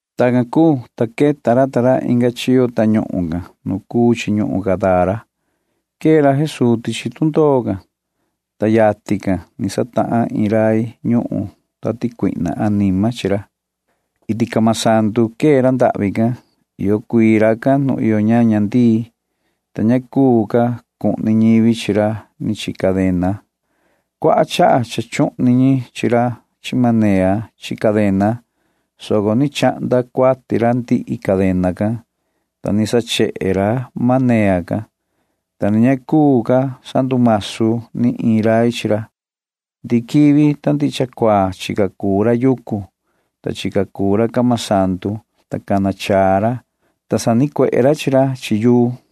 Tacan cuu, ta queta ra ta ra inga chiyo tañuhun can nu cuu chi ñuhun Gadara. Quee ra Jesuu tichi tundoo can, ta yatin ni satahan iin rai ñuhun tati cuihna anima chi ra. Iti camasandu quee ra ndahvi can. Iyo cuii racan nu iyo ñaña ndii, ta ña cuu ca cuhni ñivi chi ra ni chi cadena caa. Cuaha chaha cha chuhni ñi chi ra chi manea chi cadena, soco ni chahnda cuati ra ndihi cadena can, ta ni sachehe ra manea can, ta ni ña cuu ca sandumasu ni iin rai chi ra. Ndihi quivi ta ndihi cha cuaa chica cuu ra yucu can, ta chica cuu ra camasandu can, ta cana chaa ra, ta sanicuehe ra chi ra chi yuu can.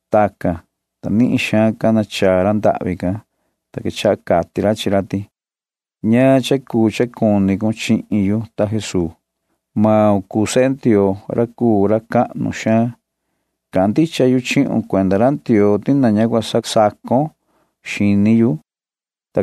Tacan, ta nihin xaan cana chaa ra ndahvi can, ta quechaha cati ra chi ra ti: ―¿Ñaan cha cuu cha cuni cun chihin yu, ta Jesuu? Maun cuu sehe Ndioo ra cuu ra cahnu xaan. Cahan rai yu chihun cuenda ra Ndioo ti na ña cua sasacon xini yu ―cati ra.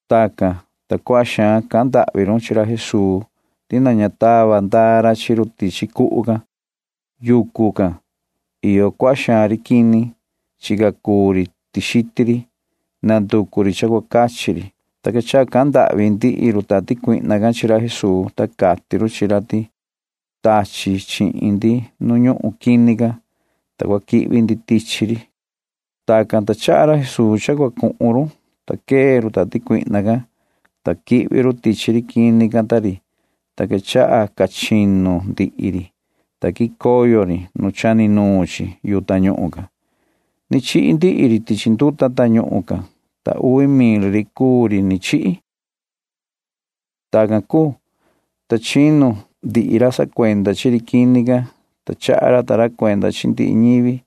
Tacan, ta cuaha xaan cahan ndahvi xaan run chi ra Jesuu ti na ña cua tava ndaa ra chi run tichi cuhu can. Yucu can iyo cuaha xaan ri quini. Chica cuu ri tixiti ri. Nanducu ri cha cua cachi ri, ta quechaha cahan ndahvi ndihi run tati cuihna can chi ra Jesuu, ta cati run chi ra ti: ―Tachi cun chi ndi nu ñuhun quini can, ta cua quihvi ndi tichi ri ―cati run ta run. Tacan, ta chaha ra Jesuu cha cua cuhun run, ta quee run tati cuihna can, ta quihvi run tichi maan quini can, ta quechaha ca chinu ndihi ri quini, ta quicoyo ri nu chani nuun chi yu tañuhun can. Ni chihi ndihi ri tichi nduta tañuhun can, ta uvi mil ri cuu ri ni chihi. Tacan cuu, ta chinu ndihi ra sacuenda chi ri quini can, ta chaha ra ta ra cuenda chi ndihi ñivi can.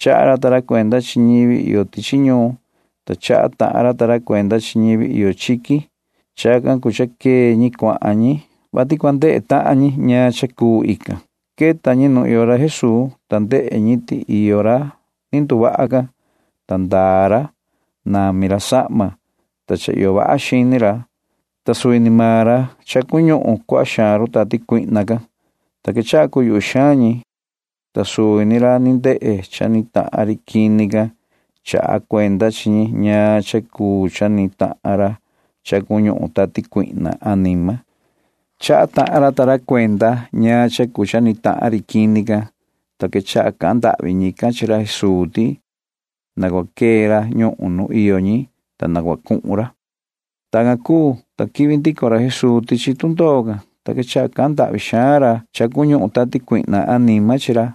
Chaha ra ta ra cuenda chi ñivi iyo tichi ñuun, ta chaha tahan ra ta ra cuenda chi ñivi iyo chiqui. Chacan cuu cha quee ñi cuahan ñi, vati cua ndehe tahan ñi ñaan cha cuu cha ni cuu. Queta ñi nu iyo ra Jesuu, ta ndehe ñi ti iyo ra cha ndehe tu ndoho can, ta ndaa ra. Nami ra sahma, ta cha iyo vaha xini ra, ta suvi ni maan ra cuu ra cha cuñuhun cuaha xaan run tati cuihna can, ta quechaha cuyuhvi xaan ñi, ta suvi ni ra ni ndehe cha ni tahan ri quini can chaha cuenda chi ñi ñaan cha cuu cha ni tahan ra cha ñuhun tati cuihna anima. Chaha tahan ra ta ra cuenda ñaan cha cuu cha ni tahan ri quini can, ta quechaha cahan ndahvi ñican chi ra Jesuu ti na cua quee ra ñuhun nu iyo maan ñi, ta na cua cuhun ra. Tacan cuu, ta quihvi ndico ra Jesuu tichi tundoo can, ta quechaha cahan ndahvi xaan ra cha cuñuhun tati cuihna anima chi ra,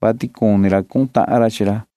vati cuni ra cuhun tahan ra chi ra,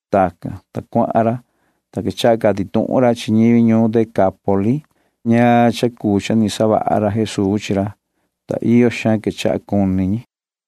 Tacan, ta cuahan ra, ta quechaha cati tuhun ra chi ñivi ñuhun Decápoli can ñaan cha cuu cha ni savaha ra Jesuu chi ra, ta iyo xaan quechaha cuni ñi.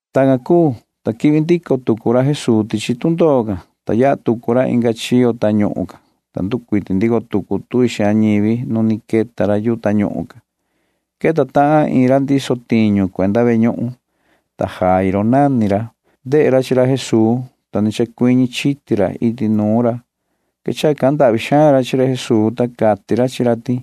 Tacan cuu, ta quihvi ndico tucu ra Jesuu tichi tundoo can, ta yaha tucu ra inga chiyo tañuhun can, ta nducuiti ndico tucu tuvi ñivi nu ni queta ra yu tañuhun can. Queta tahan iin ra ndiso tiñu cuenda ve ñuhun, ta Jairo nani ra. Ndehe ra chi ra Jesuu, ta ni chacuiñi chiti ra iti nuun ra. Quechaha cahan ndahvi xaan ra chi ra Jesuu, ta cati ra chi ra ti: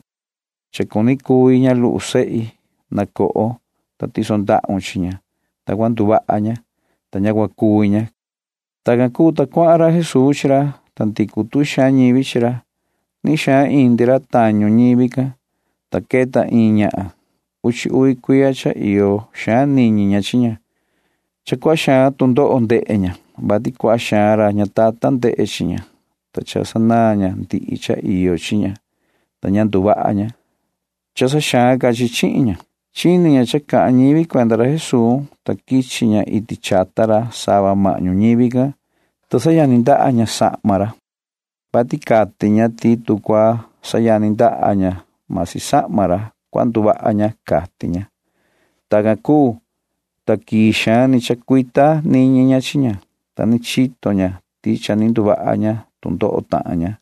―Cha cuni cuvi ña luhu sehi. Na coho, ta tison ndahun chi ña, ta cua nduvaha ña, ta ña cua cuvi ña ―cati ra chi ra. Tacan cuu, ta cuahan ra Jesuu chi ra, ta ndicu tuvi xaan ñivi chi ra. Nihin xaan indi ra tañu ñivi can, ta queta iin ñahan. Uchi uvi cuiya cha iyo xaan niñi ña chi ña. Cha cuaha xaan tu ndoho ndehe ña, vati cuaha xaan ra ñatatan ndehe chi ña, ta sanaan ña ndihi cha iyo chi ña, ta ña ni nduvaha ña, soco xaan ca cuahan sanihin chi chi ña. Chini ña cha cahan ñivi cuenda ra Jesuu, ta quichi ña iti chata ra sava mahñu ñivi can, ta sayani ndaha ña sahma ra, vati cati ña ti tu cua sayani ndaha ña―masi sahma ra, cua nduvaha ña, cati ña. Tacan cuu, ta quii xaan ni chacuita niñi ña chi ña, ta ni chito ña ti cha ni nduvaha ña tu ndoho tahan ña,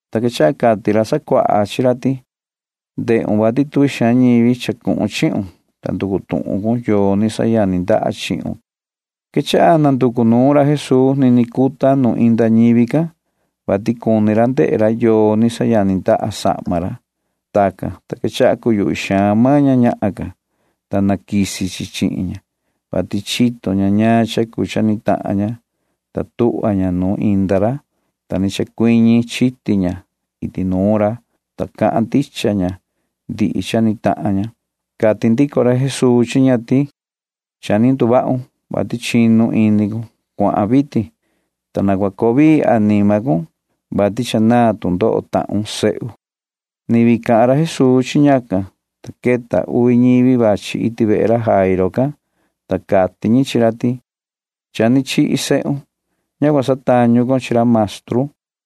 Ta quechaha cati ra sacuaha chi ra ti: ―Ndehun vati tuvi xaan ñivi chacuhun chihun, ta nducu tuhun cun yoo ni sayani ndaha chihun ―cati ra ta ra. Quechaha nanducu nuun maan ra Jesuu nini cuta nu inda ñivi can, vati cuni ra ndehe ra yoo ñi ni sayani ndaha sahma ra. Tacan, ta quechaha cuyuhvi xaan maan ña ñahan can, ta quisi chi chi ña, vati chito ña ñaan cha cuu cha ni tahan ña, ta tuhva ña nu inda ra, ta ni chacuiñi chiti ña iti nuun ra, ta cahan ndicha ña ndihi cha ni tahan ña. Cati ndico ra Jesuu chi ña ti: ―Cha ni nduvahun, vati chinu ini cun. Cuahan vitin, ta na cua coo vii anima cun, vati cha naan tu ndoho tahun, sihi ―cati ra chi ña. Ni vii cahan ra Jesuu chi ñacan, ta queta uvi ñivi vachi iti vehe ra Jairo can, ta cati ñi chi ra ti: ―Cha ni chihi sehun. Ña cua satañu con chi ra maestru ―cati ñi.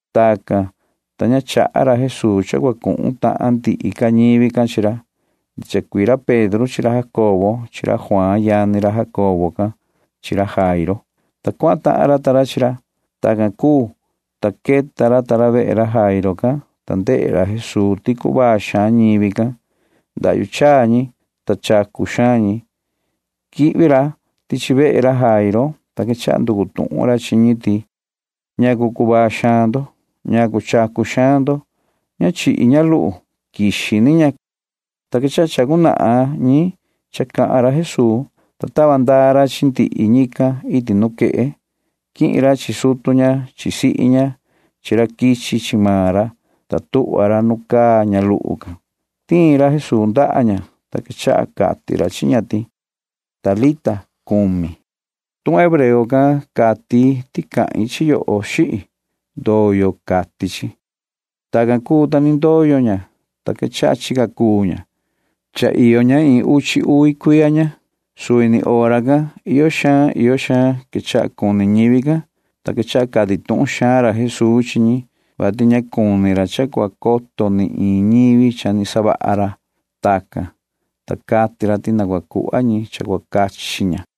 Tacan, ta ña chaha ra Jesuu cha cua cuhun tahan ndihi ca ñivi can chi ra. Mani ra Pedro chi ra Jacobo chi ra Juaan yani ra Jacobo can [chi ra Jairo] chaha ra, ta cuahan tahan ra ta ra chi ra. Tacan cuu, ta queta ra ta ra vehe ra Jairo can, ta ndehe ra Jesuu ti cuvaa xaan ñivi can. Ndahyu chaa ñi, ta chacu xaan ñi. Quihvi ra tichi vehe ra Jairo can, ta quechaha nducu tuhun ra chi ñi ti: ―¿Ñacu cuvaa xaan ndo? ¿Ñacu chacu xaan ndo? Ña chihi ña luhu ya. Quixi ni maan ña ―cati ra. Ta quechaha chacu cata ñi cha cahan ra Jesuu, ta tava ndaa ra chi ndihi ñican iti nuquehe. Quihin ra chi sutu ña chi sihi ña chi ra quichi chi maan ra, ta tuhva ra nu caa ña luhu can. Tiin ra Jesuu ndaha ña, ta quechaha cati ra chi ña ti: ―Talita cumi ―cati ra. Tuhun hebreo can cati ti cahin chi yoho, xihi. Ndoyo, cati chi. Tacan cuu, ta ni ndoyo ña, ta quechaha chica cuu ña. Cha iyo tahan ña iin uchi uvi cuiya ña. Suvi ni hora can iyo xaan iyo xaan quechaha cuni ñivi can, ta quechaha cati tuhun xaan ra Jesuu chi ñi, vati ña cuni ra cha cua coto ni iin ñivi cha ni savaha ra. Tacan, ta cati ra ti na cua cuhva ñi cha cua cachi ña.